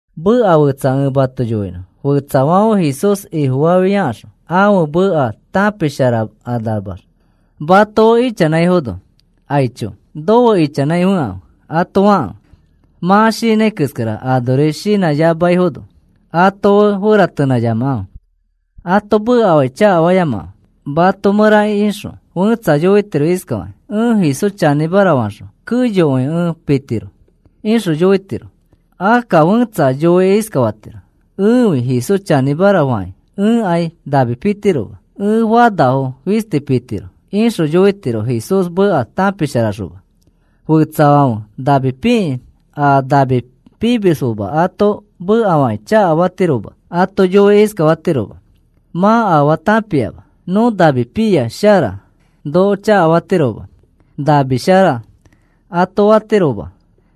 Meka fetsa ẽ mato yoinõ. Fetsafãfe Jesús Ifofafiakaxõ ãfe meka tãpisharakanamax mato fe ichanãifono, “Aicho, nofe ichanãi fekãfe,” ato fakãfe. Mã shinãi keskara anori shinãyamaifono ato fe feratenãyamakãfe. Ato mekafakĩ chakafayamakãfe. Mato mẽra ixõ fẽtsa yoitiro iskafakĩ: “Ẽ Jesús chanĩmara faxõ keyokõi ẽ pitiro,” ixõ yoitiro. Akka fẽtsa yoikĩ iskafatiro: “Ẽfi Jesús chanĩmara fakĩ ẽkai nami pitiroma. Ẽ fanafo fisti pitiro,” ixõ yoitiro Jesús meka tãpisharaxoma. Fẽtsafãfe nami pikĩ a nami pimisfoma ato mekafakĩ chakafatiroma. Ato yoikĩ iskafatirofoma: “Mã afaa tãpiama. Nõ nami pia shara, noko chakafatiroma. Nami shara,” ato fatirofoma.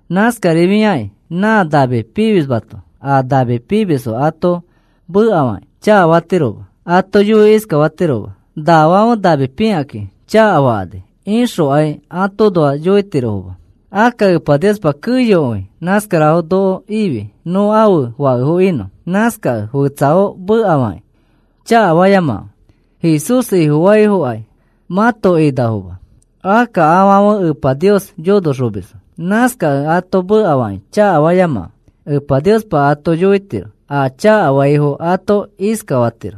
Nãskarifiakĩ nã nami pimismato a nami pimisfo ato mekafakĩ chakafatiroma. Ato yoikĩ iskafatiroma: “Nafãfe nami pikakĩ chakafakani,” ixokai atoõnoa yoitirofoma. Akka Epa Niospa keyokõi nãskarafo noko ifi nõ ãfe fakefo inõ. Nãskakẽ fetsafo mekafakĩ chakafayamakãfe. Jesús Ifofaafokai mãto inafoma. Akka afãfe Epa Nios yonoxomisfo. Nãskakẽ ato mekafakĩ chakafayamakãfe. Epa Niospa ato yoitiro. A chakafaifo ato iskafatiro: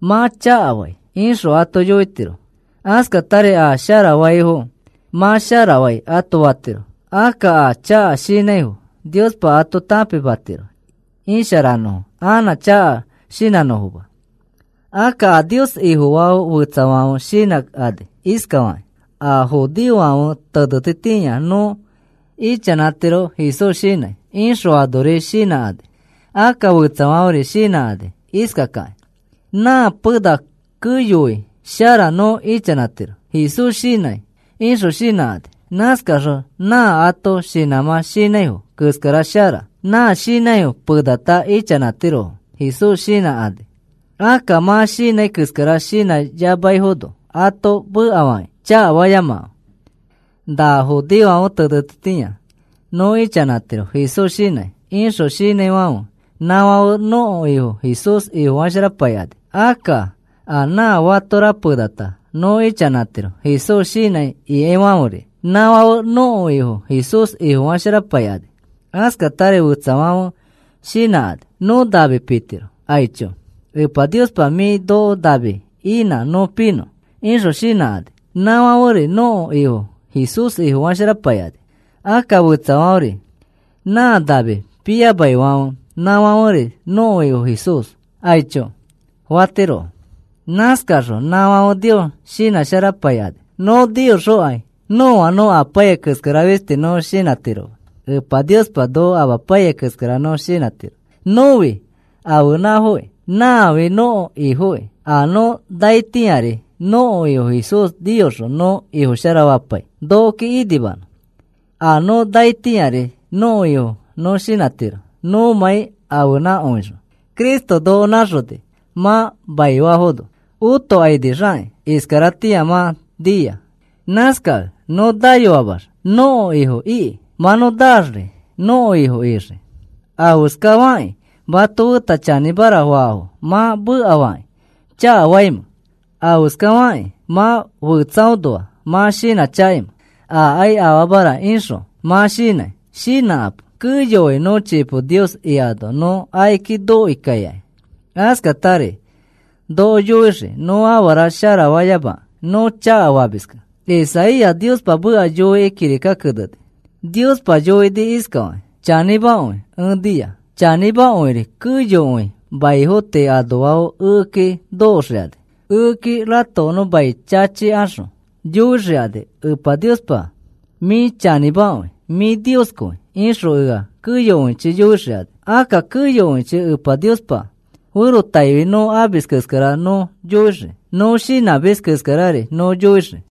“Mã chakafai,” ixõ ato yoitiro. Askatari a sharafaifo, “Mã sharafai,” ato fatiro. Akka a chaka shinãifo Niospa ato tãpimatiro isharanõfo anã chaka shinãnõfoma. Akka a Nios Ifofaafo fetsafãfe shinãkani iskafakakĩ: “A judeofãfe tenetitĩa nõ ichanãtiro Jesús shinãi,” ixõ anori shinãkani. Akka fetsafãferi shinãkani iskakakĩ: “Nã pena keyokõi shara nõ ichanãtiro Jesús shinãi,” ixõ shinãkani. Nãskaxõ nã ãto shinãmã shinãifo keskara shara. Nã shinãifo penata ichanãtirofo Jesús shinãkani. Akka mã shinãi keskara shinãyamaifono ato mekafakĩ chakafayamakãfe. “Na judeofãfe tenetitĩa nõ ichanãtiro Jesús shinãi,” ixõ shinãifãfe, nãfãfe nõko Ifo Jesús Ifofasharapaikani. Akka a nã fatora penata nõ ichanãtiro Jesús shinãi ikaifãferi, nãfãfe nõko Ifo Jesús Ifofasharapaikani. Askatari fetsafãfe shinãkani: “Nõ nami pitiro. Aicho, Epa Niospa mĩ noko nami inã nõ pinõ,” ixõ shinãkani. Nãfãferi nõko Ifo Jesús Ifofasharapaikani. Akka fetsafãferi nã nami piyamaifãfe nãfãferi nõko Ifo Jesús, “Aicho,” fatirofo. Nãskaxõ nãfãfe Nios shinãsharapaikani. Nõ niyoxõkai nõa nõ apaiyai keskara fisti nõ shinãtiroma. Epa Niospa noko amapaiyai keskara nõ shinãtiro. Nõfi ãfenãfoki. Nãfi nõko Ifokĩ. A nõ naitĩari nõko Ifo Jesús niyoxõ nõ Ifofasharapai nokoki inimanõ. A nõ naitĩari nõko Ifo nõ shinãtiro nõmãi ãfenãkõixõ. Cristo noko nãxoni. Mã maifafono otokainixakĩ. Iskaratĩa mã nia. Nãskakẽ nõ nayoamax nõko Ifo iki. Mã nõ naaxri nõko Ifo ixii. ¿Afeskafakĩ mato feta chanĩmara faafo mã mekafakĩ chakafaimẽ? ¿Afeskafakĩ mã fetsaõnoa mã shinãchakaimẽ? “Aakai afaamara,” ixõ mã shinãi. Shinãkapo, keyokõi nõ chipo Nios ikano nõ akiki nokoi kaikai. Askatari noko yoixii nõ afara sharafayamakẽ nõ chakafamiskẽ. Isaías Niospa meka yoikĩ kirika keneni. Niospa yoini iskafakĩ: “Chanĩmakõi ẽ nia. Chanĩmakõiri keyokõi maifo tii anoafo ekeki nokoxikani. Ekeki ratokonõ mai chachikaxõ yoixikani: ‘Epa Niospa, mĩ chanĩmakõi, mĩ Nioskõi,’ ixõ ea keyokõichi yoixikani.” Akka keyokõichi Epa Niospa ferotaifi nõ amis keskara nõ yoixii. Nõ shinãmis keskarari nõ yoixii.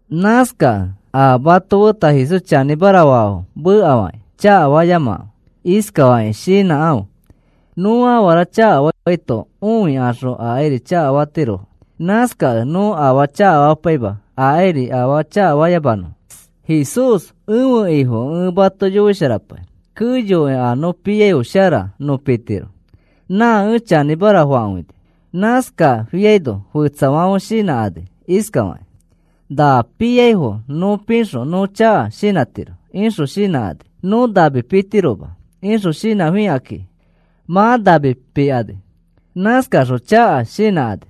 Nãskakẽ a mato feta Jesús chanĩmara faafo mekafakĩ chakafayamakãfe. Iskafakĩ shinãkãfe: “Nõ afara chakafaito õikaxõ akairi chakafatirofo. Nãskakẽ nõ afaa chakafapaima akairi afaa chakafayamanõfo.” Jesús ẽfe Ifokẽ ẽ mato yoisharapai. Keyokõi a nõ piaifo shara nõ pitiro. Nã ẽ chanĩmara fakõini. Nãskafiano fetsafãfe shinãkani iskafakakĩ: “Na piaifo nõ pixõ nõ chaka shinãtiro,” ixõ shinãkani. “Nõ nami pitiroma,” ixõ shinãfikakĩ mã nami pikani. Nãskaxõ chaka shinãkani.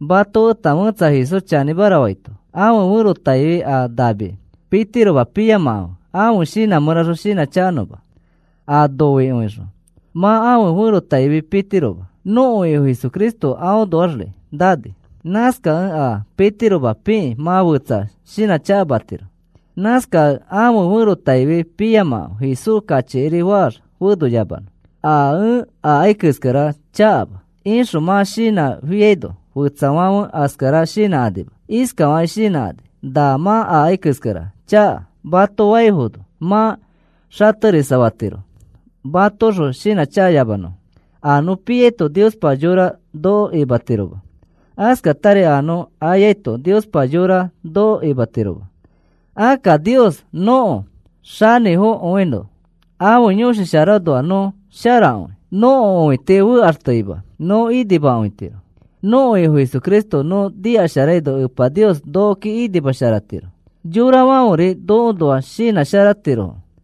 Mato feta fẽtsa Jesús chanĩmara faito ãfe ferotaifi a nami pitiroma piyamakãfe ãfe shinã mẽraxõ shinãchakanõma. A noikõixõ mã ãfe ferotaifi pitiroma. Nõko Ifo Cristo aõnoaxri nani. Nãskakẽ a pitiroma pikĩ mã fetsa shinãchakamatiro. Nãskakẽ ãfe ferotaifi piyamakãfe Jesús kachikiri faax fenoyamanõ. “A ẽ akai keskara chakama,” ixõ mã shinãfiaino fetsafãfe askara shinãkanima. Iskafakĩ shinãkani: “Na mã akai keskara chaka,” mato faifono mã xaterisafatiro matoxõ shinãchakayamanõfo. A nõ piaito Niospa yora noko imatiroma. Askatari a nõ ayaito Niospa yora noko imatiroma. Akka Nios nõko xanĩfokõino ãfe Yõshi Sharaõnoax nõ sharakõi. Nõko õiti fekaxteima nõ inimakõitiro. Nõko Ifo Cristo nõ nikasharaino Epa Nios nokoki inimasharatiro. Yorafãferi nokoõnoa shinãsharatirofo.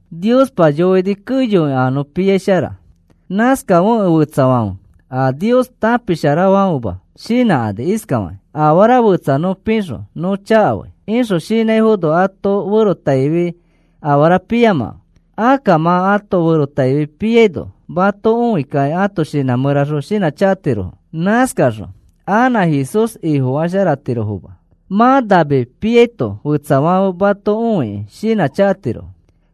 Niospa yoini keyokõi a nõ piai shara. Nãskafekẽ fetsafãfe, a Nios tãpisharafãfema shinãkani iskafakakĩ: “Afara fetsa nõ pixõ nõ chakafai,” ixõ shinãifono ãto ferotaifi afara piyamakãfe. Akka mã ãto ferotaifi piaino mato õikakĩ ãto shinã mẽra shinãchakatirofo. Nãskaxõ anã Jesús Ifofasharatirofoma. Mã nami piaito fetsafãfe mato õikĩ shinãchakatirofo.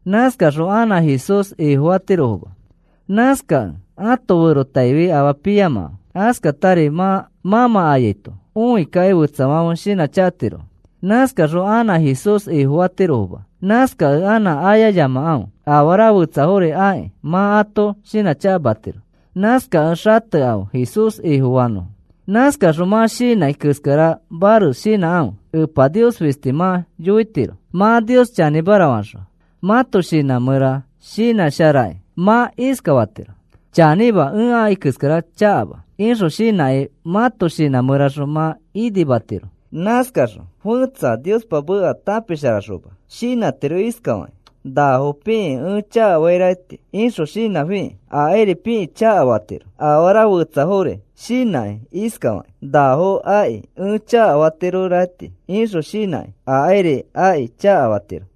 Nãskaxõ anã Jesús Ifofatirofoma. Nãskakẽ ãto ferotaifi afaa piyamakãfe. Askatari mã mãmã ayaito õikakĩ fetsafãfe shinãchakatirofo. Nãskaxõ anã Jesús Ifofatirofoma. Nãskakẽ anã ayayamakãfe. Afara fetsafori akĩ mã ato shinãchakamatiro, nãskakẽ xatekãfe Jesús Ifofanõfo. Nãskaxõ mã shinãi keskara mares shinãkãfe. Epa Nios fisti mã yoitiro. Mã Nios chanĩmara faxõ mãto shinã mẽra shinãsharakĩ mã iskafatiro: “Chanĩma, ẽ akai keskara chakama,” ixõ shinãkĩ mãto shinã mẽra mã inimatiro. Nãskaxõ fẽtsa Niospa meka tãpisharaxoma shinãtiro iskafakĩ: “Nafo pikĩ ẽ chakafairakaiti,” ixõ shinãfikĩ akairi pikĩ chakafatiro. Afara fetsafori shinãkĩ iskafakĩ: “Nafo akĩ ẽ chakafairakaiti,” ixõ shinãkĩ akairi akĩ chakafatiro.